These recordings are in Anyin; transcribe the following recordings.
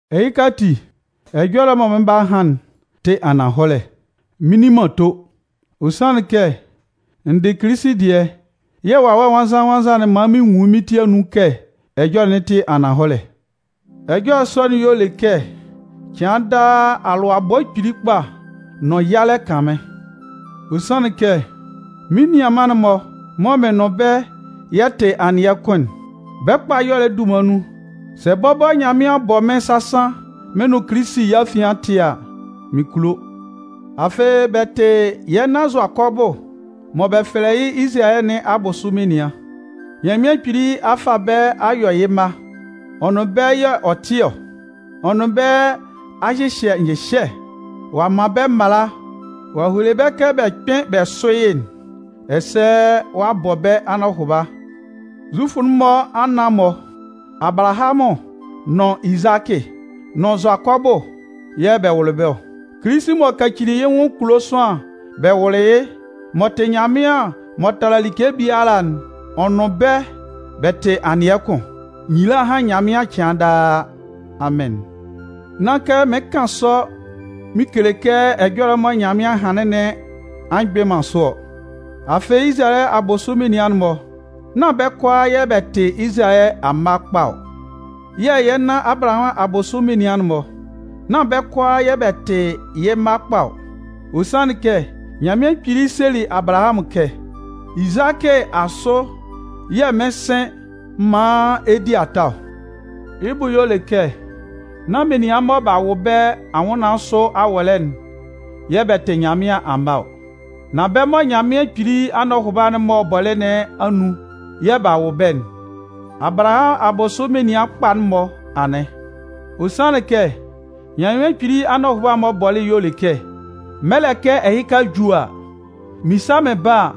Ɛhɩka ati, ɛjɔlɛ'n mɔ mɩn 'ba han'n tɩ ananhɔlɛ, mɩn nni man ato. Ɔ sanlɩn kɛ n dɩ Kilisi dɩɛ yɛ̂ Wawɛ Nwannzan-nwannzan'n man mɩn nwun yɩ́ mɩ́n ti anun kɛ ɛjɔlɛ'n tɩ ananhɔlɛ. Ɛjɔlɛ sɔ'n y'ɔ le kɛ cɩan daa, alʋabɔ kpili kpa nʋn yalɛ kan mɩ́n. Ɔ sanlɩn kɛ, mɩ́n nianman'n-mɔ mɔ mɩn nʋn bɛ́ yɛ tɩ anɩɛ kʋn'n, bɛ́ kpa ɛyɔlɛ dunman nun, sɛ bɔbɔ Nyanmɩan bɔ mɩ́n sasan mɩn nʋn Kilisi yɛ́ afian tɩ a, mɩn kulo. Afɩ bɛ tɩ yɛ́ nan Zʋakɔbʋ mɔ bɛ fɛlɛ yɩ́ Izalayɛ nɩn abʋsʋ menian. Nyanmɩan Kpili a fa bɛ́ a yɔ yɩ́ mma, ɔ nʋn bɛ́ y'ɔ tɩ ɔ. Ɔ nʋn bɛ́ a hyɩhyɛ nyɩhyɛ, ɔ'a man bɛ́ mala, ɔ'a hele bɛ́ kɛ bɛ kpɩ́n bɛ sʋ́ yɩ́'n, ɛsɛ ɔ'a bɔ bɛ́ anɔhʋba. Zufʋ'n-mɔ anan-mɔ: Abalahamʋn nʋn Izakɩ nʋn Zʋakɔbʋ yɛ̂ bɛ wʋlɩ bɛ́ ɔ. Kilisi m'ɔ kacili yɩ́ nwʋn kulo sʋanlan bɛ wʋlɩ yɩ́, m'ɔ tɩ Nyanmɩan m'ɔ tala like biala'n, ɔ nʋn bɛ́ bɛ tɩ anɩɛ kʋn. Nyila hán Nyanmɩan cɩan daa. Amɩn. Nán kɛ mɩɩn kan sɔ mɩn kele kɛ ɛjɔlɛ'n mɔ Nyanmɩan hanlɩn nɩn a mgbɩn man sʋ ɔ. Afɩ Izalayɛ abʋsʋ menian'n-mɔ, nán bɛ́ kʋalaa yɛ bɛ tɩ Izalayɛ amma kpa ɔ. Yɛ̂ yɛ́ nan Abalahamʋn abʋsʋ menian'n-mɔ, nán bɛ́ kʋalaa yɛ̂ bɛ tɩ yɩ́ mma kpa ɔ. Ɔ sanlɩn kɛ Nyanmɩan Kpili selɩ Abalahamʋn kɛ: Izakɩ asʋ yɛ̂ mɩn 'sɩn maan ɛ di ata ɔ. Yɩ́ bʋ y'ɔ kɛ nán menian mɔ b'a wʋ bɛ́ anwʋnnaan sʋ awɔlɛ'n yɛ̂ bɛ tɩ Nyanmɩan amma ɔ. Nan bɛ́ mɔ Nyanmɩan Kpili anɔhʋba'n m'ɔ bɔlɩ nɩn anun yɛ̂ b'a wʋ bɛ́'n, Abalahamʋn abʋsʋ menian kpa'n-mɔ anɩn. Ɔ sanlɩn kɛ Nyanmɩan Kpili anɔhʋba'n m'ɔ bɔlɩ'n y'ɔ le kɛ: Mɛlɛ kɛ ɛhɩka ju a, mɩn 'sa mɩn ba. Mɩn sa mɩn ba a,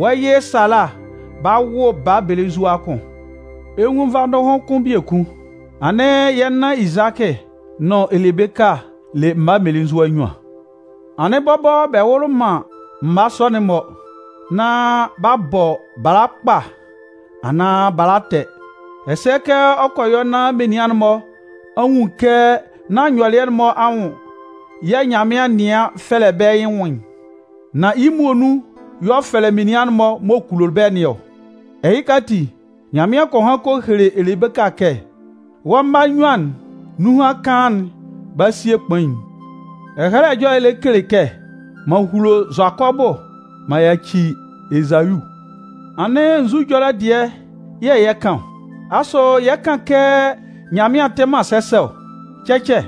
wɔ́ yɩ Sala 'ba wʋ baa belenzua kʋn. Ɛ 'nwun nvadʋhʋn kʋn biekun. Anɩn yɛ́ nan Izakɩ nʋn Elebeka le mma mmelenzua nnyuan. Anɩn bɔbɔ bɛ wʋlɩ man mma sɔ'n-mɔ nán b'a bɔ bala kpa anaan bala ɛtɛ'n, ɛsɛ kɛ ɔ kɔ yɔ nán menian'n-mɔ a nwun kɛ nán nyɔlɩɛ'n-mɔ anwʋn yɛ̂ Nyanmɩan nɩan fɛlɛ bɛ́ yɩ́ nwʋn'n, nan yɩ́ muonun y'ɔ fɛlɛ menian'n-mɔ m'ɔ kulo bɛ́ nɩn ɔ. Ɛhɩka ati, Nyanmɩan kɔ han kɔ hele Elebeka kɛ: Wɔ́ mma nnyuan'n, nunhan kaan'n 'ba sie kpain'n. Ɛhɛlɛ Ɛjɔlɛ lɛ kele kɛ: M'an hulo Zʋakɔbʋ m'an yaci Ezayu. Anɩn nzu ɛjɔlɛ dɩɛ yɛ̂ yɛ 'kan ɔ? Asʋ yɛ 'kan kɛ Nyanmɩan tɩ man sɛsɛ ɔ? Cɛcɛ!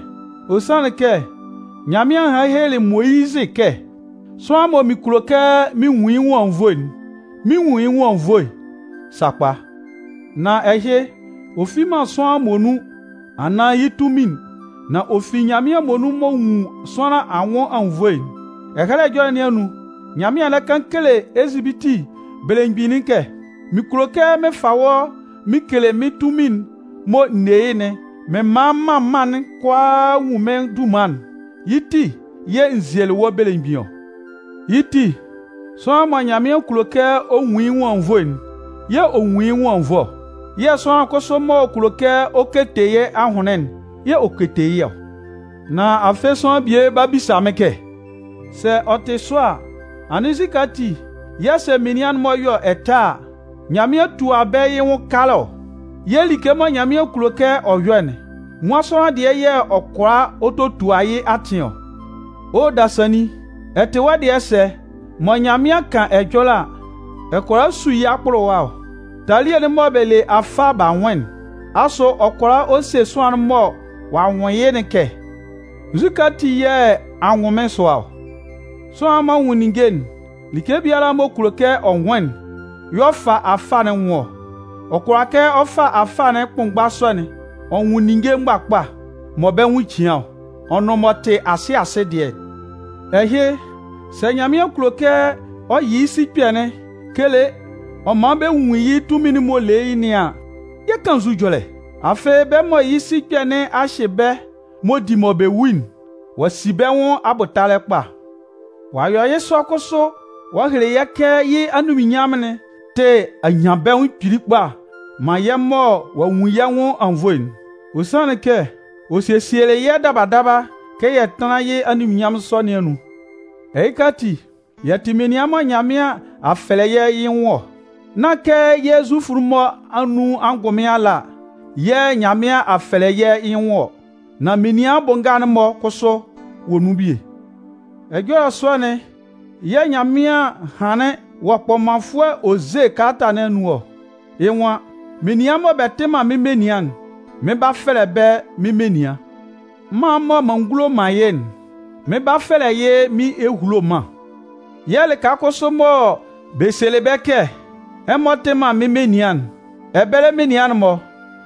Ɔ sanlɩn kɛ Nyanmɩan hanlɩn helelɩ Moyizɩ kɛ: Sʋanlan mɔ mɩn kulo kɛ mɩn nwun yɩ́ nwʋn anwunnvoe'n, mɩn 'nwun yɩ́ nwʋn anwunnvoe sakpa! Nan ɛhɩ, ɔ fi man sʋanlan muonun anaan yɩ́ tunmin'n, nan ɔ fi Nyanmɩan muonun m'ɔ nwun sʋanlan anwʋn anwunnvoe'n. Ɛhɛlɛ Ɛjɔlɛ nɩn anun, Nyanmɩan lɛ kan kele Ezipiti belemgbin'n kɛ: Mɩn kulo kɛ mɩn fa wɔ́ mɩn kele mɩ́n tunmin'n mɔ n ne yɩ́'n mɩn man mân mân'n kʋalaa nwun mɩ́n dunman'n, yɩ́ ti yɛ̂ n zielɩ wɔ́ belemgbin ɔ. Yɩ́ ti, sʋanlan mɔ Nyanmɩan kulo kɛ ɔ nwun yɩ́ nwʋn anwunnvoe'n yɛ̂ ɔ nwun yɩ́ nwʋn anwunnvoe ɔ. Yɛ̂ sʋanlan kʋsʋ m'ɔ kulo kɛ ɔ kete yɩ́ ahʋnlɩn'n yɛ̂ ɔ kete yɩ́ ɔ. Nan afɩ sʋanlan bie 'ba bisa mɩ́n kɛ: “Sɛ ɔ tɩ sɔ a, anɩn nzukɛ ati yɛ̂ sɛ menian'n-mɔ yɔ ɛtɛ a, Nyanmɩan tua bɛ́ yɩ́ nwʋn kalɛ ɔ? Yɛ̂ like mɔ Nyanmɩan kulo kɛ ɔ yɔ'n, nwan sʋanlan dɩɛ yɛ̂ ɔ kʋala ɔ totua yɩ́ atɩn ɔ?” O dasannin, ɛ tɩ wɔ́ dɩɛ sɛ mɔ Nyanmɩan kan ɛjɔlɛ a, ɛ kʋala su yɩ́ akpʋlʋwa ɔ? Talie'n mɔ bɛ le afâ b'a nwʋn'n, asʋ ɔ kʋala ɔ se sʋanlan'n mɔ ɔ'a nwʋn yɩ́'n kɛ: “Nzukɛ ati yɛ̂ a nwʋn mɩ́n sʋa ɔ?” Sʋanlan'n m'ɔ nwʋn ninnge'n, like biala m'ɔ kulo kɛ ɔ nwʋn'n y'ɔ fa afâ'n nwʋn ɔ. Ɔ kʋala kɛ ɔ fa afâ kʋnmgba sɔ'n ɔ nwʋn ninnge mgbakpa mɔ bɛ́ nwʋn cian ɔ nʋn m'ɔ tɩ asɩ asɩ dɩɛ. Ɛhɩ sɛ Nyanmɩan kulo kɛ ɔ yɩ yɩ́ sikpɛ'n kele ɔ man bɛ nwun yɩ́ tunmin'n m'ɔ le yɩ́ nɩn an, yɛ 'kan nzu ɛjɔlɛ? Afɩ bɛ́ mɔ yɩ́ sikpɛ nɩn a hyɩ bɛ́ m'ɔ di mɔ bɛ wu'n, ɔ'a si bɛ́ nwʋn abʋtalɛ kpa. Ɔ'a yɔ yɩ́ sɔ kʋsʋ ɔ'a hele yɛ́ kɛ yɩ́ anunminnyanmʋn'n tɩ anyanbɛnwʋn kpili kpa man yɛ́ mɔ ɔ'a nwun yɛ́ nwʋn anwunnvoe'n. Ɔ sanlɩn kɛ ɔ sesielɩ yɛ́ daba daba kɛ yɛ tánlan yɩ́ anunminnyanmʋn sɔ nɩn anun. Ɛhɩka ati, yɛ tɩ menian mɔ Nyanmɩan a fɛlɛ yɛ́ yɩ́ nwʋn ɔ. Nán kɛ yɛ́ Zufʋ'n-mɔ anun angʋnmɩn ala yɛ̂ Nyanmɩan a fɛlɛ yɛ́ yɩ́ nwʋn ɔ, nan menian bʋ nga'n-mɔ kʋsʋ wɔ nun bie. Ɛjɔlɛ sɔ'n yɛ̂ Nyanmɩan hanlɩn wɔ kpɔmanfʋɛ Oze kalata nɩn anun ɔ. Yɩ́ nwan: Menian mɔ bɛ tɩ man mɩ́n menian'n, mɩn 'ba fɛlɛ bɛ́ mɩ́n menian. Mân mɔ m'an ngulo man yɩ́'n, mɩn 'ba fɛlɛ yɩ́ mɩ́n ehulo mân. Yɛ̂ lɩka kʋsʋ mɔ bɛ selɩ bɛ́ kɛ: ‘Ɛmɔ tɩ man mɩ́n menian'n,’ ɛbɛlɛ menian'n-mɔ,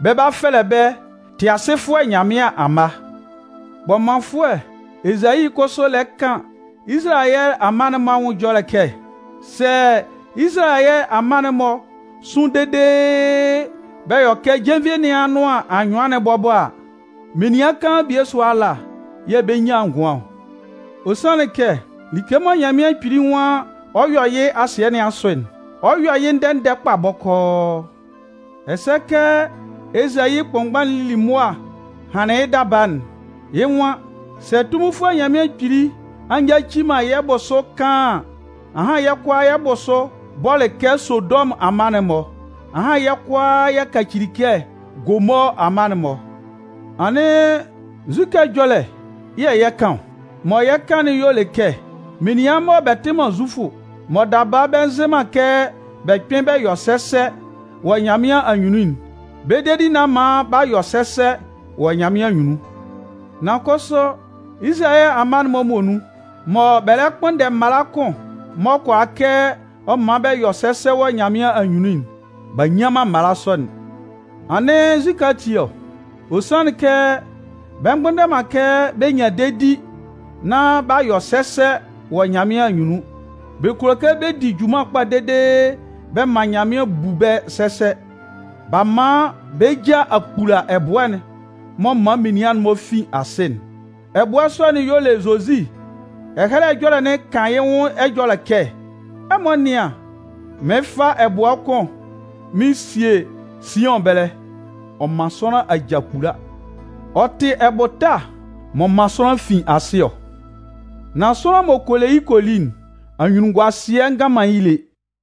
bɛ 'ba fɛlɛ bɛ́ ‘Tɩasɩfʋɛ Nyanmɩan amma.’ Kpɔmanfʋɛ Ezayi kʋsʋ lɛ kan Izalayɛ amma'n-mɔ anwʋn ɛjɔlɛ kɛ: Sɛ Izalayɛ amma'n-mɔ sʋn dede bɛ yɔ kɛ jenvie nɩn anʋan anyʋan'n bɔbɔ a, menian kaan bie sʋa ala yɛ̂ bɛ 'nyan ngʋan ɔ. Ɔ sanlɩn kɛ like mɔ Nyanmɩan Kpili nwan ɔ 'yɔ yɩ́ asɩɛ nɩn asʋ'n, ɔ 'yɔ yɩ́ ndɛ-ndɛ kpa bɔkɔɔ. Ɛsɛ kɛ Ezayi kʋnmgba'n lili mʋa hanlɩn yɩ́ daba'n, yɩ́ nwan: Sɛ Tunminfʋɛ Nyanmɩan Kpili a nyaci man yɛ́ bʋsʋ kaan an, ahan yɛ́ kʋalaa yɛ́ kʋsʋ yɛ́ bʋsʋ bɔlɩ kɛ Sodɔmʋn amma'n-mɔ, ahan yɛ́ kʋalaa yɛ kacili kɛ Gomɔɔ amma'n-mɔ. Anɩn nzukɛ ɛjɔlɛ yɛ̂ yɛ 'kan ɔ? Mɔ yɛ 'kan'n y'ɔ lɛ kɛ menian mɔ bɛ tɩ man Zufʋ, mɔ daba bɛ nzɩ man kɛ bɛ kpɩn bɛ yɔ sɛsɛ wɔ Nyanmɩan anyunnun'n, bɛ́ dedi nɩn a man b'a yɔ sɛsɛ wɔ Nyanmɩan anyunnun. Nan kʋsʋ Izalayɛ amma'n-mɔ muonun mɔ bɛ lɛ kpʋnndɛ mala kʋn m'ɔ kʋala kɛ ɔ man bɛ yɔ sɛsɛ wɔ Nyanmɩan anyunnun'n, b'a nnyan man mala sɔ'n. Anɩn nzukɛ ati ɔ? Ɔ sanlɩn kɛ bɛ mgbʋnndɛ man kɛ bɛ nyan dedi nán b'a yɔ sɛsɛ wɔ Nyanmɩan anyunnun. Bɛ kulo kɛ bɛ di junman kpa dede bɛ man Nyanmɩan bu bɛ́ sɛsɛ. B'a man bɛ́ ja a kpula ɛbʋɛ'n m'ɔ man menian'n-mɔ fin asɩ'n. Ɛbʋɛ sɔ'n y'ɔ le Zozi. Ɛhɛlɛ Ɛjɔlɛ'n kan yɩ́ nwʋn ɛjɔlɛ kɛ: Ɛmɔ nɩ́an, mɩɩn fa ɛbʋɛ kʋn mɩn sie Siʋn ɛbɛlɛ, ɔ man sʋanlan aja kpula. Ɔ tɩ ɛbʋta m'ɔ man sʋanlan fin asɩ ɔ. Nan sʋanlan m'ɔ kɔ le yɩ́ kɔ li'n, anyunnunguasɩɛ ngan man yɩ́ lé.